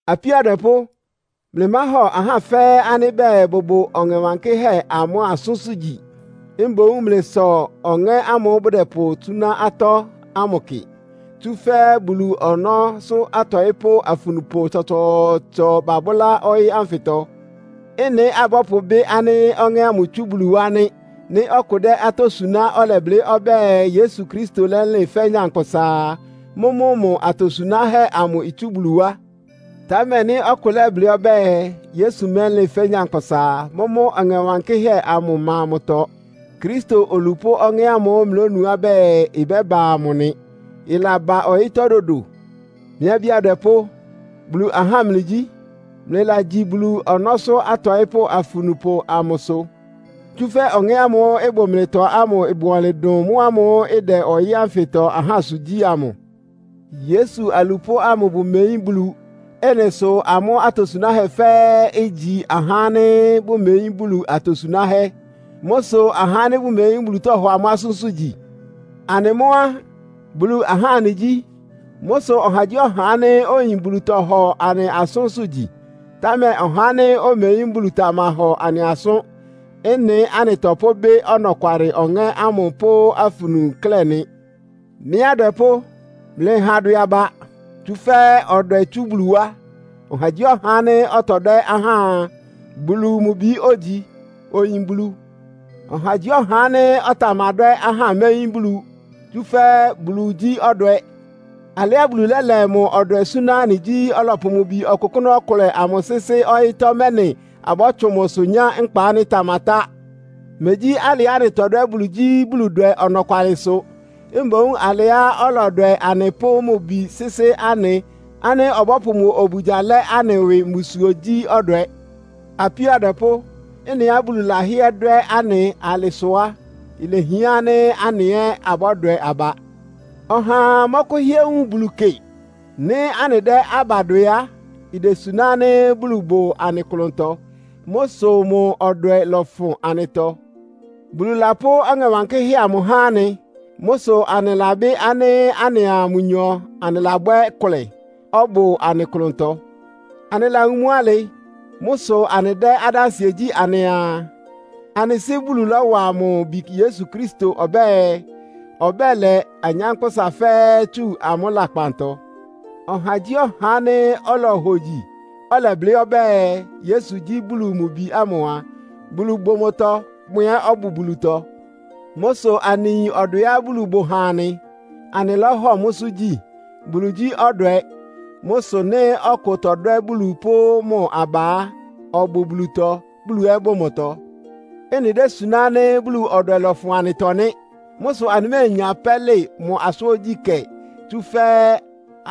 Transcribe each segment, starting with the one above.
Apíó adwɛpʋ́, mlɩmáhɔ ahá fɛ́ɛ́ ánɩ́ bɛɛ, bʋbʋ Ɔŋɛ Wankɩ́hɛ́ amʋ asʋ́nsʋ́ gyi. Mboún mlɩsɔ ɔŋɛ́ ámʋ́ʋ́ bʋdɛpʋsúná atɔ́ ámʋ kɩ. Tsúfɛ́ Bulu ɔnɔ́sʋ́ atɔɩ́pʋ́ afunupʋ tsɔtsɔɔtsɔ babʋ́lá ɔyɩ́ ánfɩtɔ. Ɩ́nɩ apʋ́bɩ ánɩ́ ɔŋɛ́ ámʋ itsú Bulu wá nɩ́. Nɩ́ ɔkʋ dɛ́ atɔ́ suná, ɔlɛblɩ́ ɔbɛ́ɛ, Yesu Kristo lɛ́lɩn fɛ́ nyankpʋsa a, mʋ́mʋ́ mʋ atosunáhɛ́ amʋ itsú Bulu wá. Támɛ nɩ́ ɔkʋ lɛ́blɩ́ ɔbɛ́ɛ, Yesu mɛ́lɩn fɛ́ nyankpʋsa a, mʋ́mʋ́ Ɔŋɛ Wankɩ́hɛ́ amʋ ɩma mʋtɔ. Kristo olupʋ́ ɔŋɛ́ ámʋ́ʋ́ mlɩlónuá bɛɛ, ɩbɛ́ba amʋ nɩ. Ɩlaba ɔyɩ́tɔ́ dodo. Mɩ́ abí adwɛpʋ́, Bulu ahá mlɩgyí. Mlɩlagyi Bulu ɔnɔ́sʋ́ atɔɩ́pʋ́ afunupʋ amʋsʋ. Tsúfɛ́ Ɔŋɛ́ ámʋ́ʋ́ ɩbʋ mlɩtɔ ámʋ bʋ ɔnlɩn dʋn mʋ́ámʋ́ʋ́ ɩdɛ ɔyɩ́ ánfɩtɔ ahásʋ gyí amʋ. Yesu alupʋ́ ámʋ bʋmeyín Bulu. Ɩ́nɩ sʋ amʋ́ atosunáhɛ́ fɛ́ɛ́ igyi ahá ánɩ́ bʋmeyín Bulu atosunáhɛ́. Mʋ́ sʋ ahá ánɩ́ bʋmeyín Bulu tɔ́hɔ amʋ́ asʋ́nsʋ́ gyi. Anɩ mʋ́ á, Bulu ahá anɩgyí. Mʋ́ sʋ ɔhagyíɔha ánɩ́ oyin Bulu tɔhɔ anɩ asʋ́nsʋ́ gyi. Támɛ ɔhá ánɩ́ omeyín Bulu tamahɔ anɩ asʋ́n. Ɩ́nɩ anɩtɔpʋ́bɩ́ ɔnɔkwalɩ Ɔŋɛ́ ámʋ pʋ́ afunu klɛ́ nɩ. Mɩ́ adwɛpʋ́, mlɩha adwɛ aba, tsúfɛ́ ɔdwɛ itsú Bulu wá. Ɔhagyíɔha ánɩ́ ɔtɔdwɛ́ ahá a, Bulu mʋ bi ógyi, oyin Bulu. Ɔhagyíɔha ánɩ́ ɔtamadwɛ́ ahá méyín Bulu, tsúfɛ́ Bulu gyí ɔdwɛ. Alɩá Bulu lɛ́lɛ mʋ ɔdwɛ súná anɩ gyí, ɔlɔpʋ mʋ Bi ɔkʋkʋ́nʋ́ ɔkʋlɛ amʋ sɩ́sɩ́ ɔyɩ́tɔ́, mɛ́nɩ abɔ́tsʋn mʋsʋ nyá nkpa ánɩ́ ɩtamatá. Megyí alɩá anɩtɔdwɛ́ Bulu gyí Buludwɛ ɔnɔkwalɩsʋ. Mboún alɩá ɔlɔdwɛ anɩ, pʋ́ mʋ Bi sɩ́sɩ́ anɩ, ánɩ́ ɔbɔ́pʋ mʋ obugya lɛ anɩ ɩwɩ mbusuo gyí ɔdwɛ. Apíó adwɛpʋ́, ɩ́nɩá Bulu lɛ́hɩɛ dwɛ́ anɩ alɩ sʋ á, ilehián ánɩ́ anɩ ɛ́ abɔ́dwɛ aba. Ɔhaa mɔ́kʋ́hɩ́ɛ́ wun Bulu kɩ. Nɩ́ anɩdɛ́ aba dwɛ á, idesuná ánɩ́ Bulu bʋ anɩ klʋntɔ. Mʋ́ sʋ mʋ ɔdwɛ lɔfʋn anɩtɔ. Bulu lapʋ́ Ɔŋɛ Wankɩ́hɛ́ amʋ há anɩ. Mʋ́ sʋ anɩlabɩ́ ánɩ́ anɩa mʋnyɔ anɩlabwɛ́ kʋlɛ, ɔbʋ anɩ klʋntɔ. Anɩlawun mʋ́ alɩ. Mʋ́ sʋ anɩdɛ́ adánsɩɛ gyí anɩaa, anɩ Sɩ́ Bulu lɔ́wa mʋ Bi Yesu Kristo ɔbɛ́ɛ, ɔbɛ́lɛ anyánkpʋ́sa fɛ́ɛ́ tsu amʋ́ lakpantɔ. Ɔhagyíɔha ánɩ́ olohogyi, ɔlɛblɩ́ ɔbɛ́ɛ Yesu gyí Bulu mʋ Bi ámʋ a, Bulu bʋ mʋtɔ, mʋ ɛ́ ɔbʋ Bulutɔ. Mʋ́ sʋ anɩyin ɔdwɛá Bulu bʋ ha anɩ, anɩlɔ́hɔ mʋ́sʋ́ gyí. Bulu gyí ɔdwɛ. Mʋ́ sʋ nɩ́ ɔkʋ tɔdwɛ́ Bulu pʋ́ mʋ aba á, ɔbʋ Bulutɔ, Bulu ɛ́ bʋ mʋtɔ. Ɩ́nɩ désuná ánɩ́ Bulu ɔdwɛ lɔfʋn anɩtɔ nɩ́. Mʋ́ sʋ anɩméenya pɛ́lɩ mʋ asʋ́n ogyíkɛ́, tsúfɛ́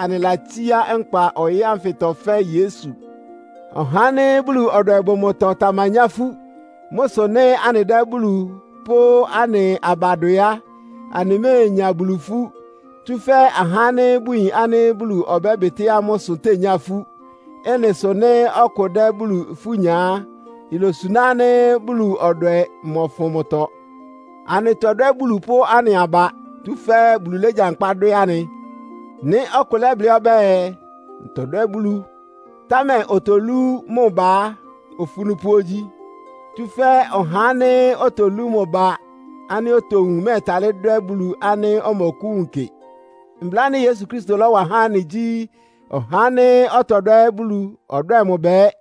anɩlatsíá nkpa ɔyɩ́ ánfɩtɔ fɛ́ Yesu. Ɔhá ánɩ́ Bulu ɔdwɛ bʋ mʋtɔ tamanyá ifú. Mʋ́ sʋ nɩ́ anɩdɛ́ Bulu pʋ́ anɩ aba dwɛ á, anɩméenya Bulu ifú. Tsúfɛ́ ahá ánɩ́ bʋyin ánɩ́ Bulu ɔbɛ́bɩtɩ́ amʋ́ ɩsʋ tényá ifú. Ɩ́nɩ sʋ nɩ́ ɔkʋ dɛ́ Bulu ifú nya á, ilosuná ánɩ́ Bulu ɔdwɛ mɔfʋn mʋtɔ. Anɩtɔdwɛ́ Bulu pʋ́ anɩ aba, tsúfɛ́ Bulu légyankpá dwɛ́ anɩ. Nɩ́ ɔkʋ lɛ́blɩ́ ɔbɛ́ɛ “Ntɔdwɛ́ Bulu,” támɛ otolú mʋ ba á, ofunupʋ ogyi. Tsúfɛ́ ɔhá ánɩ́ otolú mʋ ba ánɩ́ otowun, mɛ́ɛtalɩ́ dwɛ́ Bulu ánɩ́ ɔmɔkʋ́wun kɩ. Mbla ánɩ́ Yesu Kristo lɔ́wa há anɩ gyí, “Ɔhá ánɩ́ ɔtɔdwɛ́ Bulu ɔdwɛ́ɛ mʋ ba ɛ́.”